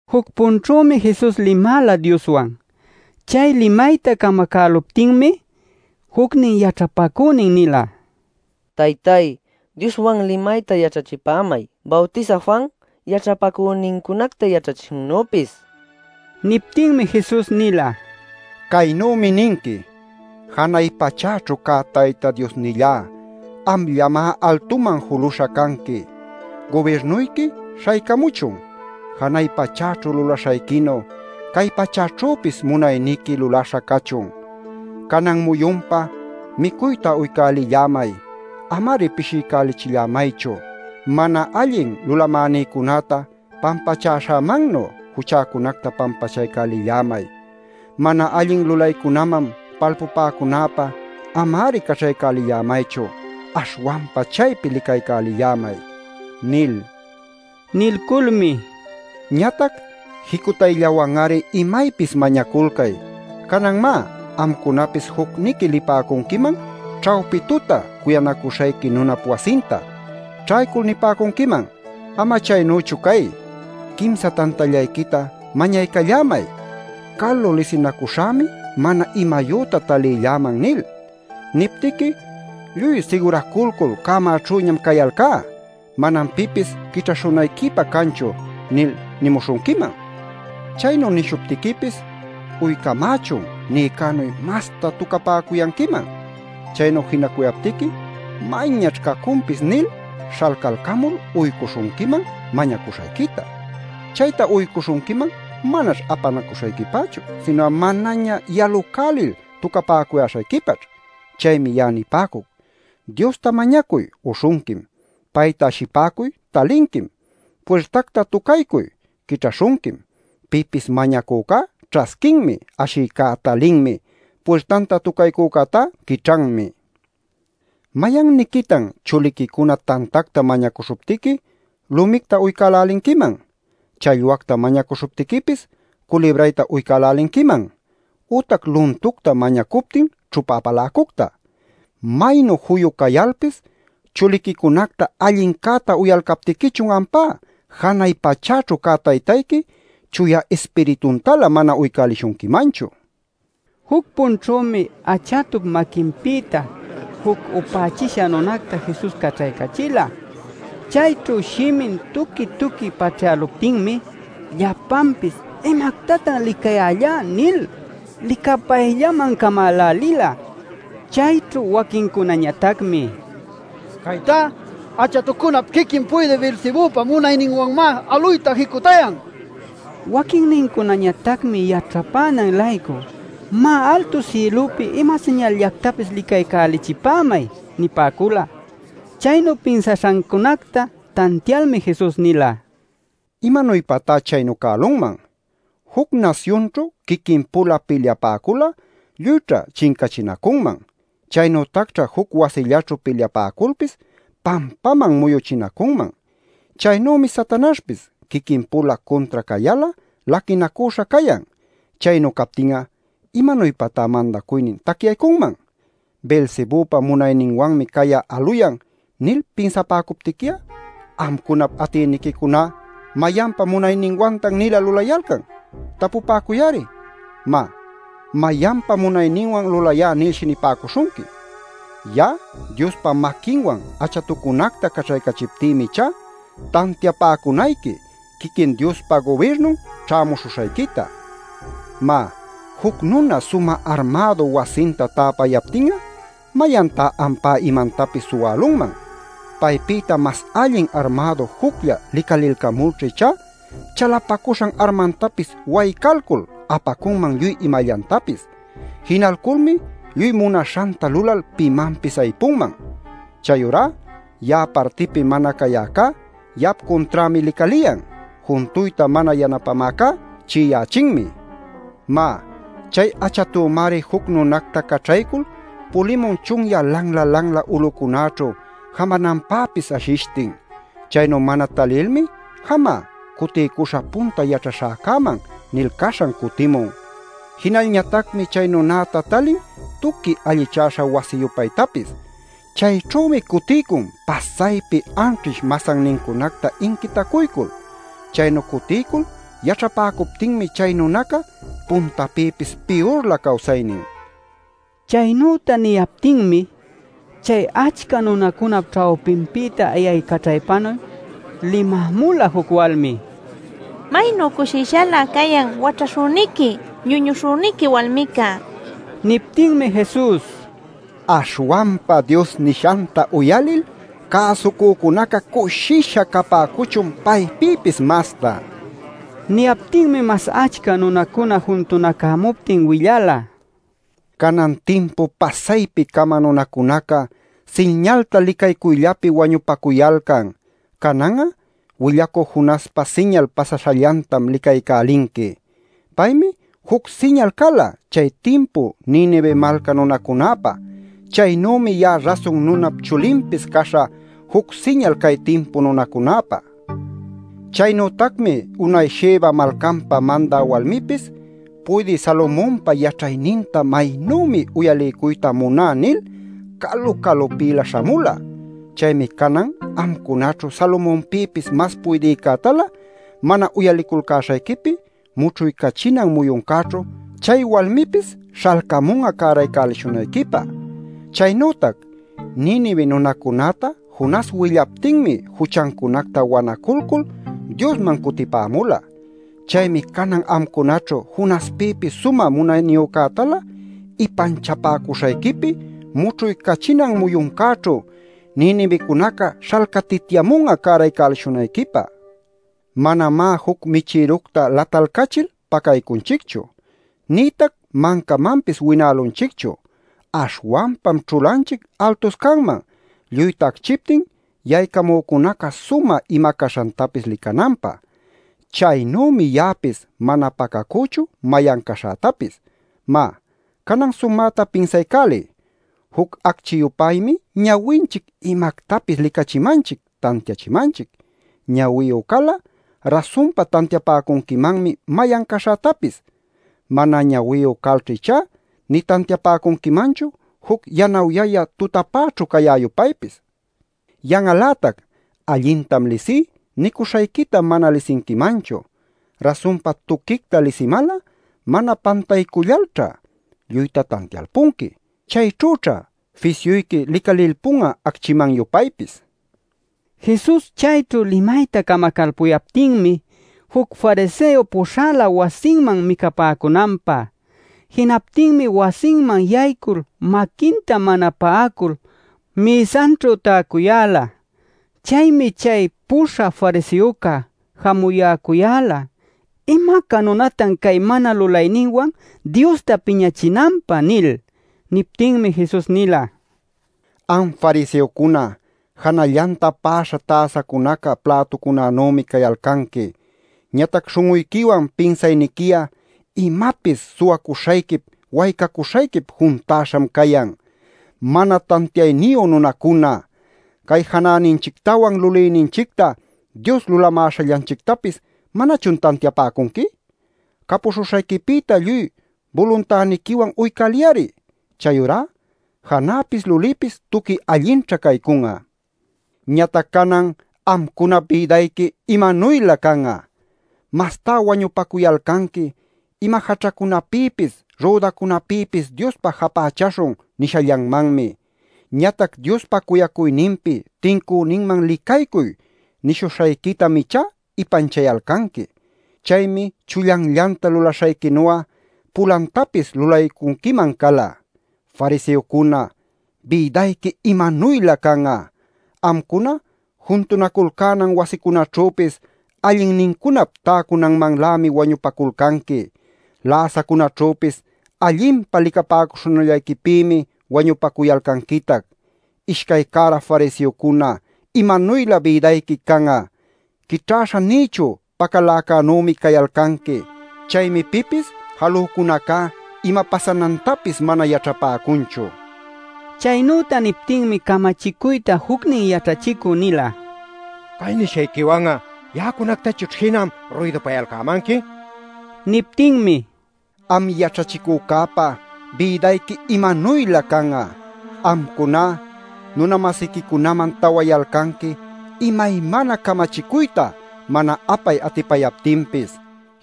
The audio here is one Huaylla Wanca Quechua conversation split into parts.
Juc-punćhümi Jesus limala Dioswan. Chay limayta camacäluptinmi jucnin yaćhapacünin nila: “Taytay, Dioswan limayta yaćhachipämay Bawtisä Juan yaćhapacünincunacta yaćhachishannüpis” nil. Niptinmi Jesus nila: “Caynümi ninqui: ‘Janay pachäćhu cä Tayta Diosnillá, amllamá altuman juluśha canqui. Gubirnuyqui śhaycamuchun. Janay pachäćhu lulaśhayquinu, cay pachäćhüpis munayniqui lulaśha cachun. Canan muyunpä micuyta uycälillämay. Ama-ari pishiycachillämaychu. Mana allin lulamänïcunäta pampachäśhämannu juchäcunacta pampachaycälillämay. Mana allin lulaycunaman palpupäcunäpä ama-ari caćhaycälillämaychu. Aśhwanpa chaypi licaycälillämay’ nil.” Nilculmi: “Ñatac jicutayllawan-ari imaypis mañaculcay. Canan má, amcunapis jucniqui lipäcunquiman ćhawpi tuta cuyanacuśhayqui nunap wasinta. Ćhaycul nipäcunquiman: ‘Ama chaynüchu cay. Quimsa tantallayquita mañaycallämay. Calu lisinacuśhämi mana imayüta talilläman’ nil. Niptiqui: ‘Lluy siguraculcul cämäćhüñam cayalcá. Manam pipis quićhäśhunayquipä canchu’ nil nimuśhunquiman. Chaynu nishuptiquipis ‘uycamächun’ nïcänuy masta tücapäcuyanquiman. Chaynu jinacuyaptiqui ‘mayñaćh cacunpis’ nil śhalcalcamul uycuśhunquiman mañacuśhayquita. Chayta uycuśhunquiman manaćh apanacuśhayquipachu sinu'a manaña yalucälil tücapäcuyäśhayquipaćh. Chaymi ya'a nipäcuc: Diosta mañacuy; uśhunquim. Payta ashipäcuy; talinquim. Puirtacta tucaycuy; quićhaśhunquim. Pipis mañacücá ćhasquinmi; ashïcá talinmi; puirtanta tucaycücätá quićhanmi. “¿Mayanniquitan chuliquicuna tantacta mañacuśhuptiqui lumicta uycälälinquiman? ¿Challwacta mañacuśhuptiquipis, culibrayta uycälälinquiman? ¿Ütac luntucta mañacuptin ćhupa apaläcucta? ¡Maynu juyu cayalpis chuliquicunacta allincäta uyalcaptiquichun ampá janay pachaćhu cä Taytayqui, Chuya Ispirituntalä mana uycälishunquimanchu!” nila. Juc-punćhümi achatup maquinpïta juc upächisha nunacta Jesus caćhaycachila. Chayćhu shimin tuqui-tuqui paćhyäluptinmi llapanpis “¿Imactatan licayällá?” nil licapayllaman camälälila. Chayćhu waquinnincunañatacmi: “¡Caytá achatucunap quiquin puydï Beelzebüpa munayninwanmá aluyta jicutayan!” nipäcun. Waquinnincunañatacmi yaćhapänan-laycu: “Má, altu sïlupi ima siñalllactapis licaycälichipämay” nipäcula. Chaynu pinsaśhancunacta tantialmi Jesus nila: “¿Imanuypatá chaynu cälunman? Juc nasyunćhu quiquin-pula pilyapäcul'a lluyćha chincachinacunman. Chaynütacćha juc wasillaćhu pilyapäculpis pampaman muyuchinacunman. Chaynümi Satanaśhpis quiquin-pula cuntra cayal'a laquinacüśha cayan. Chaynu captin'a ¿imanuypatá mandacuynin tacyaycunman? ‘Beelzebüpa munayninwanmi cay'a aluyan’ nil pinsapäcuptiqui'a amcunap atïniquicuná ¿mayanpa munayninwantan-nila lulayalcan? Tapupäcuy-ari. Má, mayanpa munayninwan lulayá nilshi nipäcuśhunqui. Ya'a Diospa maquinwan achatucunacta caćhaycachiptïmi ichá, tantiapäcunayqui quiquin Diospa gubirnun ćhämuśhuśhayquita. “Má, juc nuna sumä armädu wasinta täpayaptin'a ¿mayantá ampá imantapis suwälunman? Paypïta mas allin armädu juclla licalilcamulćha ichá chalapacuśhan armantapis waycalcul apacunman lluy imallantapis. Jinalculmi lluy munaśhanta lulal pimanpis aypunman. “Chayurá ya'a partïpi mana cayäcá, ya'ap cunträmi licaliyan; juntuyta mana yanapämäcá chi'iyächinmi. “Má, chay achatümari juc nunacta caćhaycul pulimun chunyä lanla-lanla ulucunäćhu jamananpäpis ashishtin. Chaynu mana talilmi ‘Jamá, cutiycuśhä punta yaćhaśhäcäman’ nil caśhan cutimun. Jinalñatacmi chay nunäta talin tuqui allichäśha wasi-yupaytapis. Chayćhümi cutiycun pasaypi anćhish masannincunacta inquitacuycul. Chaynu cutiycul yaćhapäcuptinmi chay nunaca puntapïpis piyurlä cawsaynin” nil. Chaynüta niyaptinmi, chay achca nunacunap ćhawpinpïta ayaycaćhaypanuy limämula juc walmi: “¡Maynu cushishalä cayan waćhaśhüniqui, ñuñuśhüniqui walmica!” nil. Niptinmi Jesus: “Aśhwanpa Dios nishanta uyalil cäsucücunaca cushisha capäcuchun paypïpis mastá” nila. Niyaptinmi mas achca nunacuna juntunacämuptin willala: “Canan timpu pasaypi-cama nunacunaca siñalta licaycuylläpi wañupacuyalcan. Canan'a willacü Jonaspa siñal pasaśhallantam licaycälinqui. Paymi juc siñal cala chay timpu Ninive malca nunacunäpä. Chaynümi ya'a Rasun Nunap Chulinpis caśhä juc siñal cay timpu nunacunäpä. “Chaynütacmi unay Sheba malcanpa mandä walmipis ‘Puydï Salomonpa yaćhayninta maynümi uyaliycuyta muná’ nil calu-calupïlä śhamula. Chaymi canan amcunaćhu Salomonpïpis mas puydïcätalä mana uyaliculcäśhayquipi mućhuycachinan muyuncäćhu chay walmipis śhalcamun'a cäraycälishunayquipä. Chaynütac Ninive nunacunäta Jonas willaptinmi juchancunacta wanaculcul Diosman cutipämula. Chaymi canan amcunaćhu Jonaspïpis sumä munayniyücätalä ipanchapäcuśhayquipi mućhuycachinan muyuncäćhu Ninivecunaca śhalcatityamun'a cäraycälishunayquipä. Manamá juc michïructa latalcachil pacaycunchichu. Nïtac mancamanpis winälunchichu. Aśhwanpam ćhulanchic altuscanman lluyta acchiptin yaycamücunäca sumä ima caśhantapis licananpä. [Chaynümi ya'apis mana pacacüchu mayan caśhätapis.] “Má, canan sumäta pinsaycäliy. Juc acchi-yupaymi ñawinchic imactapis licachimanchic, tantiachimanchic. Ñawiyu cal'a, rasunpa tantiapäcunquimanmi mayan caśhätapis. Mana ñawiyu calćha ichá, nï tantiapäcunquimanchu juc yanawyayä tutapäćhu cayä-yupaypis. Yan'al-lätac ‘Allintam lisí’ nicuśhayquita mana lisinquimanchu. Rasunpa tuquicta lisimal'a, mana pantaycullalćha, lluyta tantialpunqui. Chayćhüćha fisyuyqui licalilpun'a acchiman-yupaypis” nila. Jesus chayćhu limayta camacalpuyaptinmi juc fariseo puśhala wasinman micapäcunanpä. Jinaptinmi wasinman yaycul maquinta mana pa'acul mïsanćhu täcuyäla. Chaymi chay puśhä fariseoca jamuyäcuyäla “¡¿Imaca nunatan cay mana lulayninwan Diosta piñachinanpä?!” nil. Niptinmi Jesus nila: “Am fariseocuna janällanta pa'aśha täsacunaca plätucunanümi cayalcanqui. Ñatac śhun'uyquiwan pinsayniqui'a imapis suwacuśhayquip waycacuśhayquip juntäśham cayan. ¡Mana tantiayniyu nunacuna! Cay janäninchictawan lulïninchicta Dios lulamäśhallanchictapis ¿manachun tantiapäcunqui? Capuśhuśhayquipïta lluy buluntäniquiwan uycäliy-ari. Chayurá janäpis lulïpis tuqui allinćha caycun'a. “Ñatac canan ¡amcunap bïdayqui imanuylä can'a! Mastá wañupacuyalcanqui ‘Ima jaćhacunapïpis, rüdacunapïpis Diospä japächaśhun’ nishallanmanmi. Ñatac Diospa cuyacuyninpi tincüninman licaycuy nishuśhayquitam ichá ipanchayalcanqui. Chaymi chullanllanta lulaśhayquinu'a pulantapis lulaycunquiman cala. “Fariseocuna, ¡bïdayqui imanuylä can'a! Amcuna juntunaculcänan wasicunaćhüpis allinnincunap täcunanmanlämi wañupaculcanqui. Läsacunäćhüpis allinpa licapäcuśhunallayquipïmi wañupacuyalcanquitac. “Ishcay cära fariseocuna, ¡imanuylä bïdayqui can'a! Quićhäśha nïchu pacaläcänümi cayalcanqui. Chaymi pipis jalücunacá ima pasanantapis mana yaćhapäcunchu” nila. Chaynüta niptinmi camachicuyta jucnin yaćhachicü nila: “¡Cay nishayquiwan'a ya'acunactachućh jinam ruydupayalcämanqui!” nil. Niptinmi: “Am yaćhachicücäpa bïdayqui ¡imanuylä can'a! Amcuná nuna-masiquicunaman täwayalcanqui imaymana camachicuyta mana apay atipayaptinpis.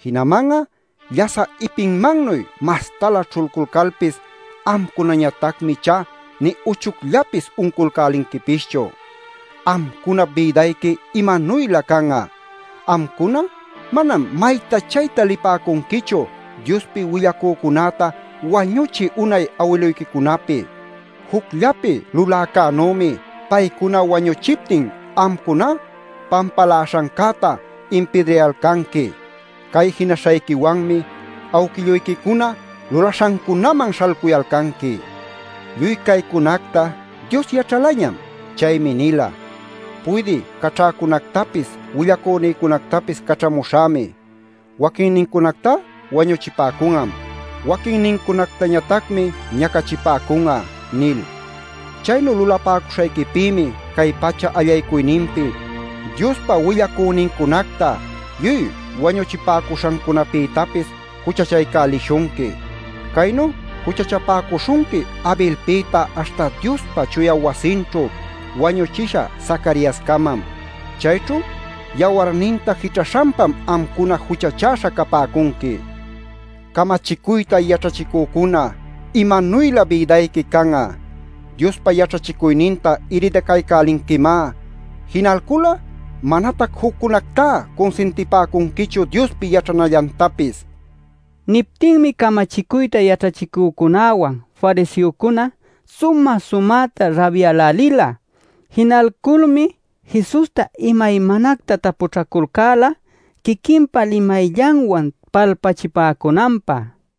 Jinaman'a llasä ipinmannuy mastalä ćhulculcalpis amcunañatacmi ichá nï uchucllapis unculcälinquipischu. “¡Amcunap bïdayqui imanuylä can'a! Amcuna manam mayta chayta lipäcunquichu Diospi willacücunäta wañuchï unay awiluyquicunapi. Jucllapi luläcänümi paycuna wañüchiptin amcuná pampaläśhancäta impidrayalcanqui. Cay jinaśhayquiwanmi awquilluyquicuna lulaśhancunaman śhalcuyalcanqui. “Lluy caycunacta Dios yaćhalañam. Chaymi nila ‘Puydï caćhäcunactapis willacünïcunactapis caćhamuśhämi. Waquinnincunactá wañuchipäcun'am. Waquinnincunactañatacmi ñacachipäcun'a’ nil. Chaynu lulapäcuśhayquipïmi cay pacha allaycuyninpi Diospa willacünincunacta lluy wañuchipäcuśhancunapïtapis juchachaycälishunqui. Caynu juchachapäcuśhunqui Abelpïta aśhta Diospa chuya wasinćhu wañuchisha Zacariascamam. Chayćhu yawarninta jićhaśhanpam amcuna juchachäśha capäcunqui. “Camachicuyta yaćhachicücuna, ¡imanuylä bïdayqui can'a! Diospa yaćhachicuyninta iridacaycälinquimá. Jinalcul'a manatac juccunactá cunsintipäcunquichu Diospi yaćhanallantapis” nila. Niptinmi camachicuyta yaćhachicücunäwan fariseocuna sumä-sumäta rabyälälila. Jinalculmi Jesusta imaymanacta tapućhaculcäla quiquinpa limayllanwan palpachipäcunanpä.